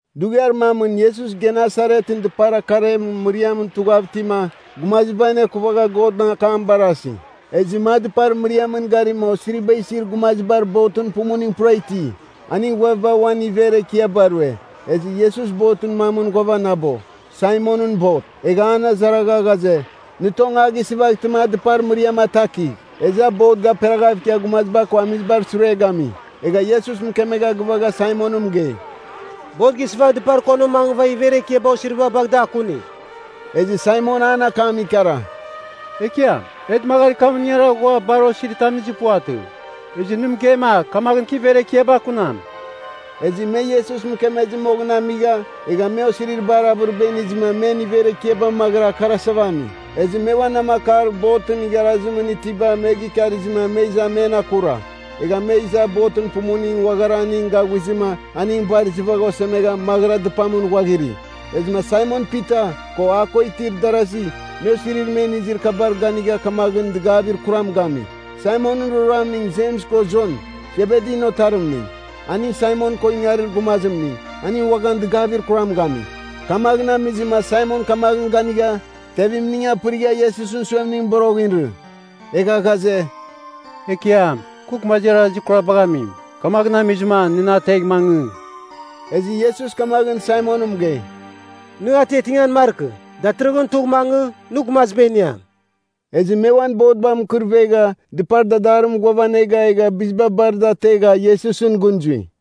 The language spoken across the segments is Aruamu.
Dughiar mamɨn Iesus Genesaretɨn dɨpar akarer mɨriamɨn tughav itima, gumaziba anekuvagha Godɨn akam barasi. Ezɨma a dɨpar mɨriamɨn garima osiriba isir gumazibar botɨn pumuning pura iti. Aningɨn ghuaviba uan iver ekiaba rue. Ezɨ Iesus botɨn mamɨn ghuavanabo, Saimonɨn bot. Egha an azaragha ghaze, nɨ tong a gɨsɨvaghtɨma a dɨpar mɨriam atakigh. Ezɨ a bot gaperaghav ikia gumaziba ko amizibar sure gami. Egha Iesus mɨkemegha gɨvagha Saimonɨn mɨgei, “Bot gɨsɨvagh dɨpar konimɨn mangɨva iver ekiaba osiriba bagh da akunigh.” Ezɨ Saimon an akam ikara, “Ekiam, e dɨmagarir kamɨn ingara ghua bar osiritam inizir puvatɨ. Ezɨ nɨ mɨgeima kamaghɨn kɨ iver ekiaba akunam.” Ezɨ me Iesus mɨkemezɨ moghɨn amigha, egha me osirir bar avɨriba inizɨma men iver ekiaba maghɨra akarasava ami. Ezɨ me uan namakar botɨn igharazimɨn itiba me gikarizɨma me iza men akura, egha me iza botɨn pumuning uaghara aning gaghuizɨma aning bar izɨvagha osemegha maghɨra dɨpamɨn ghuaghiri. Ezɨma Saimon Pita, ko a ko itir darasi, me osirir me inizir kabar ganigha kamaghɨn dɨgavir kuram gami. Saimonɨn roroamning Jems ko Jon, Sebedin otarimning. Aning Saimon ko ingarir gumazimning, aning uaghan dɨgavir kuram gami. Kamaghɨn amizɨma Saimon kamaghɨn ganigha, tevimning apɨrigha Iesusɨn suemningɨn boroghɨn irɨ. Egha ghaze, “Ekiam, kɨ gumazir arazir kurabagh amim! Kamaghɨn amizɨma nɨ na ategh mangɨ.” Ezɨ Iesus kamaghɨn Saimonɨn mɨgei, “Nɨ atiatingan markɨ, datɨrɨghɨn tugh mangɨ, nɨ gumaziba iniam.” Ezɨ me uan botba mɨkɨrvegha, dɨpar dadarimɨn ghuavanega, egha biziba bar da ategha Iesusɨn gɨn zui.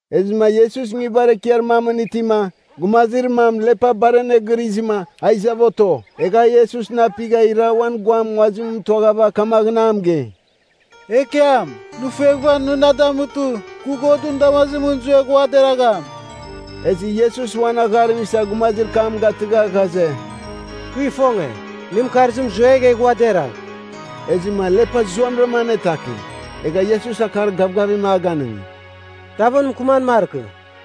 Ezɨma Iesus nguibar ekiar mamɨn itima, gumazir mam lepa bar anegɨrizɨma, a izava oto. Egha a Iesusɨn apighava ira uan guam nguazim mɨtuaghava kamaghɨn a mɨgei, “Ekiam, nɨ fueghɨva nɨ na damutɨ, kɨ Godɨn damazimɨn zuegh ua deragham.” Ezɨ Iesus uan agharim isa gumazir kam gatɨgha ghaze, “Kɨ ifonge. Nɨn mɨkarzim zuegh, egh ua deragh.” Ezɨma lepa zuamɨra anetaki. Egha Iesus akar gavgavim a ganɨngi, “Tavɨn mɨkɨman markɨ.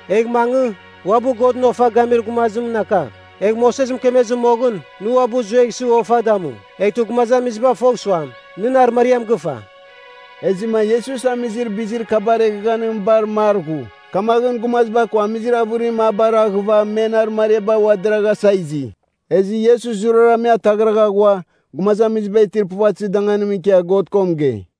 Egh mangɨ, uabɨ Godɨn ofa gamir gumazimɨn akagh, egh Moses mɨkemezɨ moghɨn, nɨ uabɨ zueghsɨ ofa damu. Eghtɨ gumazamiziba fogh suam, nɨn arɨmariam gɨfa.” Ezɨma Iesus amizir bizir kabar eghaghanim bar mar ghu. Kamaghɨn gumaziba ko amizir avɨrim a baraghɨva men arɨmariaba ua deraghasa izi. Ezɨ Iesus zurara me ataghragha ghua, gumazamiziba itir puvatɨzir danganimɨn ikia God ko mɨgei.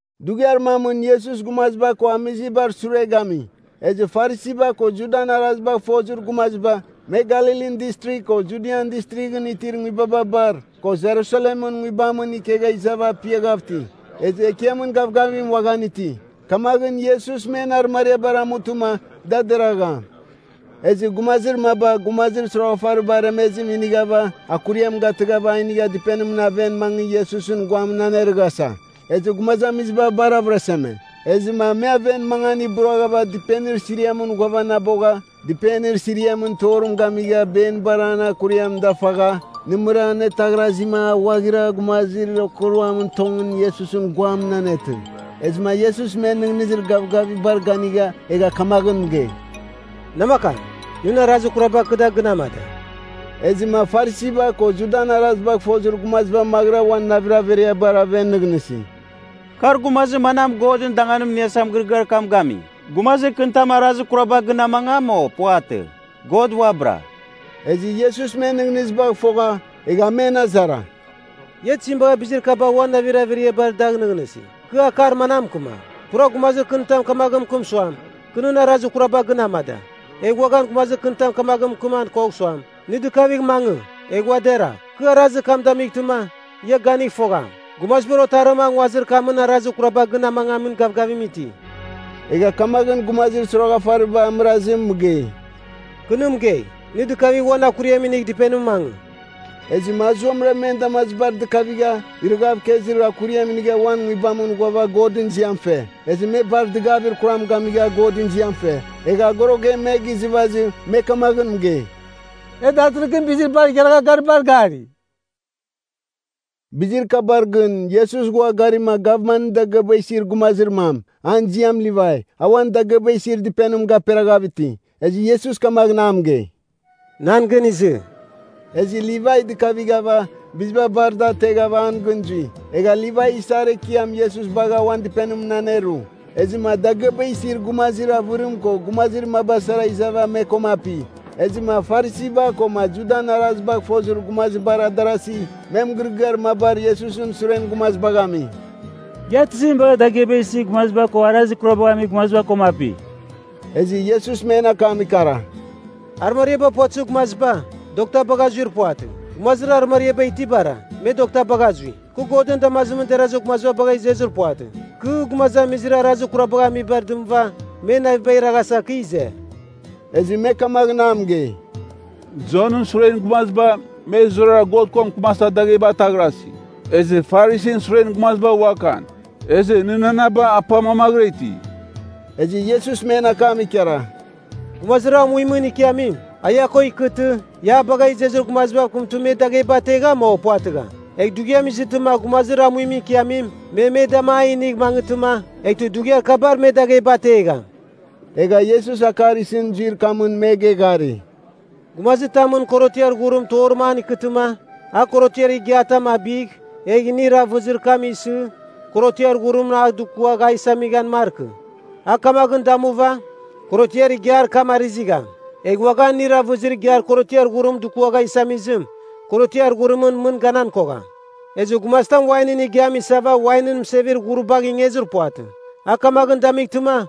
Dughiar mamɨn Iesus gumaziba ko amizibar sure gami. Ezɨ Farisiba ko Judan arazibagh fozir gumaziba, me Galilin Distrigh ko Judian Distrighɨn itir nguibaba bar, ko Jerusalemɨn nguibamɨn ikegha izava apiaghav iti. Ezɨ Ekiamɨn gavgavim uaghan iti, kamaghɨn Iesus men arɨmariabar amutɨma da deragham. Ezɨ gumazir maba gumazir soroghafariba aremezim inighava akuriam gatɨghava a inigha dɨpenimɨn aven mangɨ Iesusɨn guamɨn anerɨghasa. Ezɨ gumazamiziba bar avɨraseme. Ezɨma me aven mangan iburaghava dɨpenir siriamɨn ghuavanabogha dɨpenir siriamɨn torim gamigha benibar an akuriam dafagha, nɨmɨra anetaghrazima a ghuaghira gumazamizir okuruamɨn tongɨn Iesusɨn guamɨn anetɨ. Ezɨma Iesus men nɨghnɨzir gavgavibar ganigha, egha kamaghɨn mɨgei, “Namakam, nɨn arazir kuraba kɨ da gɨn amada.” Ezɨma Farisiba ko Judan arazibagh fozir gumaziba maghɨra uan navir averiabar aven nɨghnɨsi, “Kar gumazir manam Godɨn danganim iniasa mɨgɨrɨgɨar kam gami? Gumazir kɨnitam arazir kuraba gɨn amangam, o puvatɨ? God uabɨra.” Ezɨ Iesus men nɨghnɨzibagh fogha, egha a men azara, “Ia tizim bagha bizir kabar uan navir averiabar dagh nɨghnɨsi? Kɨ akar manam mɨkɨmam? Pura gumazir kɨnitam kamaghɨn mɨkɨm suam, kɨ nɨn arazir kuraba gɨn amada. Egh uaghan gumazir kɨnitam kamaghɨn mɨkɨman kogham suam, nɨ dɨkavigh mangɨ, egh ua deragh. Kɨ arazir kam damightɨma, ia ganigh fogham, Gumazibar Otarim a nguazir kamɨn arazir kuraba gɨn amangamin gavgavim iti.” Egha kamaghɨn gumazir soroghafariba amɨrazim mɨgei, “Kɨ nɨ mɨgei, nɨ dɨkavigh uan akuriam inigh dɨpenimɨn mangɨ.” Ezɨma a zuamɨra men damazibar dɨkavigha, irɨghav ikezir akuriam inigha uan nguibamɨn ghuava Godɨn ziam fe. Ezɨ me bar dɨgavir kuram gamigha Godɨn ziam fe. Egha agorogem me gizɨvazɨ me kamaghɨn mɨgei, “E datɨrɨghɨn bizir bar igharagha garibar gari.” Bizir kabar gɨn Iesus ghua garima gavmanɨn dagɨaba isir gumazir mam, an ziam Livai, a uan dagɨaba isir dɨpenim gaperaghav iti. Ezɨ Iesus kamaghɨn a mɨgei, “Nan gɨn izɨ.” Ezɨ Livai dɨkavighava, biziba bar da ateghava an gɨn zui. Egha Livai isar ekiam Iesus bagha uan dɨpenimɨn aneru. Ezɨma dagɨaba isir gumazir avɨrim ko gumazir maba sara izava me koma api. Ezɨma Farisiba koma Judan arazibagh fozir gumazibar adarasi, me mɨgɨrɨgɨar mabar Iesusɨn suren gumazibagh ami, “Ia tizim bagha dagɨaba isir gumaziba ko arazir kurabagh amir gumaziba koma api?” Ezɨ Iesus men akam ikara, “Arɨmariaba puvatɨzir gumaziba, dokta bagha zuir puvatɨ. Gumazir arɨmariaba itibara, me dokta bagha zui. Kɨ Godɨn damazimɨn derazir gumaziba bagha izezir puvatɨ. Kɨ, gumazamizir arazir kurabagh amibar dɨmɨva men navibagh iraghasa, kɨ ize.” Ezɨ me kamaghɨn a mɨgei, “Jonɨn suren gumaziba, me zurara God ko mɨkɨmasa dagheba ataghrasi. Ezɨ Farisin suren gumaziba uakan. Ezɨ nɨnanaba apa mamaghɨra iti.” Ezɨ Iesus men akam ikara, “Gumazir amuimɨn ikiamim, a ia ko ikɨtɨ, ia a bagha izezir gumazibav kɨmtɨ me dagheba ategham, o puvatɨgham? Egh dughiam izɨtɨma gumazir amuimɨn ikiamim me me dama a inigh mangɨtɨma, eghtɨ dughiar kabar me dagheba ategham.” Egha Iesus akar isɨn zuir kamɨn me geghari, “Gumazitamɨn korotiar ghurim torim an ikɨtɨma, a korotiar igiatam abigh, egh inir avɨzir kam isɨ, korotiar ghurim a dukuagh a isaman markɨ. A kamaghɨn damuva, korotiar igiar kam arɨzigham. Egh uaghan inir avɨzir igiar korotiar ghurim dukuagha isamizim, korotiar ghurimɨn mɨn ganan kogham. Ezɨ gumazitam wainɨn igiam isava wainɨn mɨsevir ghuribagh ingezir puvatɨ. A kamaghɨn damightɨma,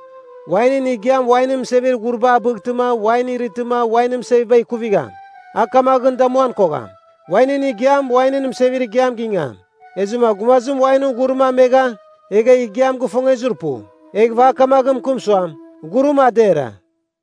wainɨn igiam wainɨn mɨsevir ghuriba a bightɨma wain irɨtɨma wainɨn mɨseviba ikuvigham. A kamaghɨn damuan kogham. Wainɨn igiam, wainɨn mɨsevir igiam gingam. Ezɨma gumazim wainɨn ghurim amegha, egha igiam gifongezir pu. Eghɨva a kamaghɨn mɨkɨm suam, ‘Ghurim a dera.’”